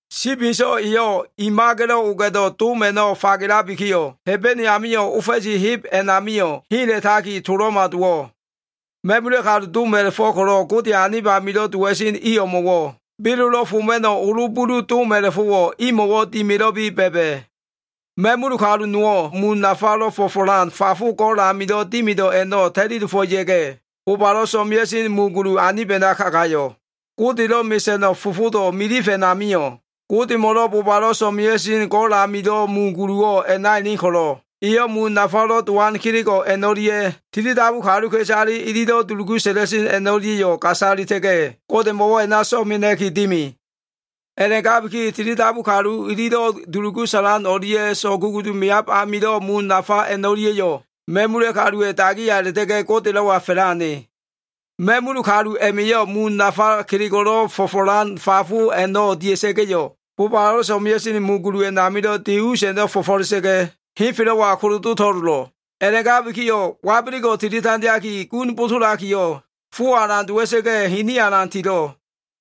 Sibi Inso꞉ eyo꞉ i maga꞉lo꞉ oga꞉do꞉ dom a꞉no꞉ fagelabikiyo꞉, Hebene amio꞉ ofa꞉si heb a꞉namio꞉ hela꞉taki to꞉lo꞉ma dowo꞉. Ma꞉mula꞉ kalu dom a꞉la꞉fo꞉ ko꞉lo꞉ Godeya꞉ anib amilo꞉ dowa꞉sen i o꞉mo꞉wo꞉ belolo꞉ foma꞉no꞉ olo bulu dom a꞉la꞉fo꞉wo꞉ imo꞉wo꞉ dimilo꞉bi ba꞉ba꞉. Ma꞉mul kalu nowo꞉ mun nafalo꞉ fo꞉fo꞉lan fafo go꞉l amilo꞉ dimido꞉ a꞉no꞉ ta꞉li dofo꞉ ya꞉ga꞉, bobalo꞉ so꞉mea꞉sen mu gulu anib a꞉na kagayo꞉. Godelo꞉ mesa꞉no꞉ fofodo꞉ milif a꞉namio꞉ Godemo꞉ bobalo꞉ so꞉mea꞉sen go꞉l amilo꞉ mu guluwo꞉ a꞉na elen ko꞉lo꞉, eyo꞉ mun nafalo꞉ dowan kelego꞉ a꞉no꞉lia꞉, tilidabu kaluka꞉isale ililo꞉ dulugu sa꞉la꞉sen a꞉no꞉lia꞉yo꞉ gasalita꞉ga꞉, Godemo꞉wo꞉ a꞉na so꞉mena꞉ki dimi. A꞉la꞉gabiki tilidabu kalu ililo꞉ dulugu sa꞉lan a꞉no꞉lia꞉ so꞉kugulu meab amilo꞉ mun nafa a꞉no꞉lia꞉yo꞉ ma꞉mula꞉ kaluwa꞉ dagiya a꞉la꞉ta꞉ga꞉ Godelo꞉wa fa꞉la꞉ ane. Ma꞉mul kalu a꞉ma꞉yo꞉ mun nafa kelego꞉lo꞉ fo꞉fo꞉lan fafo a꞉no꞉ dia꞉sa꞉ga꞉yo꞉, bobalo꞉ so꞉mea꞉sen mu gulu a꞉namilo꞉ deseg a꞉no꞉ fo꞉fo꞉la꞉sa꞉ga꞉, henfelo꞉wa kolodo to꞉lolo꞉. A꞉la꞉gabikiyo꞉ wabelego꞉ tili tandeaki, gun bosolakiyo꞉, fowo꞉ alan dowa꞉sa꞉ga꞉, hiniyo꞉ alan tilo꞉.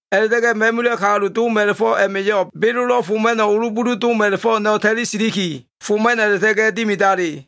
A꞉la꞉ta꞉ga꞉ ma꞉mula꞉ kalu dom a꞉la꞉fo꞉ a꞉ma꞉yo꞉ belolo꞉ foma꞉no꞉ olo bulu dom a꞉la꞉fo꞉ a꞉no꞉ ta꞉li siliki, foma꞉no꞉ a꞉la꞉ta꞉ga꞉ dimidali.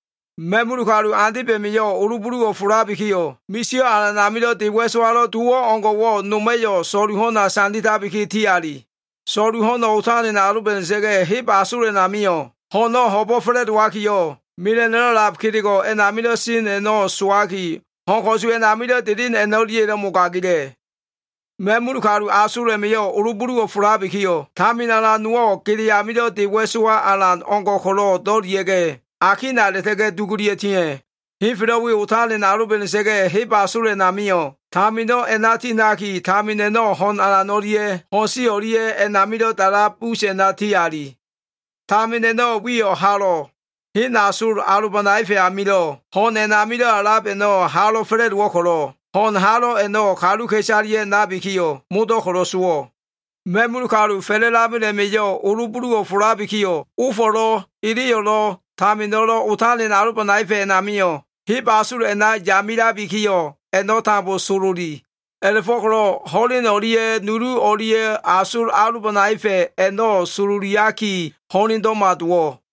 Ma꞉mul kalu andeb a꞉ma꞉yo꞉ olo buluwo꞉ folabikiyo꞉, misio꞉ alan amilo꞉ de wa꞉sowalo꞉ dowo꞉ o꞉ngo꞉wo꞉, noma꞉yo꞉ so꞉lu ho꞉na sanditabiki, ti ali. So꞉lu ho꞉no꞉ otalen aloba꞉da꞉sa꞉ga꞉, heb asol a꞉namio꞉, ho꞉no꞉ ho꞉bo꞉ fa꞉la꞉dowakiyo꞉, mela꞉no꞉lo꞉ a꞉lab kelego꞉ a꞉namilo꞉ sen a꞉no꞉ sowaki, ho꞉n ko꞉su a꞉namilo꞉ delen a꞉no꞉lia꞉yo꞉lo꞉ mogagila꞉. Ma꞉mul kalu asol a꞉ma꞉yo꞉ olo buluwo꞉ folabikiyo꞉, tamin alan nowo꞉, gele amilo꞉ de wa꞉sowa alan o꞉ngo꞉ ko꞉lo꞉ do꞉lia꞉ga꞉, akina a꞉la꞉ta꞉ga꞉ dugulia꞉ tia꞉. Henfelo꞉ we otalen aloba꞉da꞉sa꞉ga꞉, heb asol a꞉namio꞉ tamino꞉ a꞉na ti ha꞉naki, tamin a꞉no꞉ ho꞉n alan o꞉lia꞉ ho꞉n si o꞉lia꞉ a꞉namilo꞉ da꞉lab us a꞉na ti ali. Tamin a꞉no꞉ wiyo꞉ Halo꞉. Hen asol alobanaefa꞉ amilo꞉ ho꞉n a꞉namilo꞉ a꞉lab a꞉no꞉ halo꞉ fa꞉la꞉dowo꞉ ko꞉lo꞉, ho꞉n halo꞉ a꞉no꞉ kaluka꞉isaleya꞉ nabikiyo꞉, modo꞉ ko꞉lo꞉ sowo꞉. Ma꞉mul kalu fa꞉la꞉lamel a꞉ma꞉yo꞉ olo buluwo꞉ folabikiyo꞉, ofo꞉lo꞉, eleyo꞉lo꞉, tamino꞉lo꞉ otalen alobanaefa꞉ a꞉namio꞉, heb asol a꞉na yamilabikiyo꞉, a꞉no꞉ tambo sololi. A꞉la꞉fo꞉ko꞉lo꞉ ho꞉len o꞉lia꞉ nulu o꞉lia꞉ asol alobanaefa꞉ a꞉no꞉ sololiaki ho꞉lendo꞉ma dowo꞉.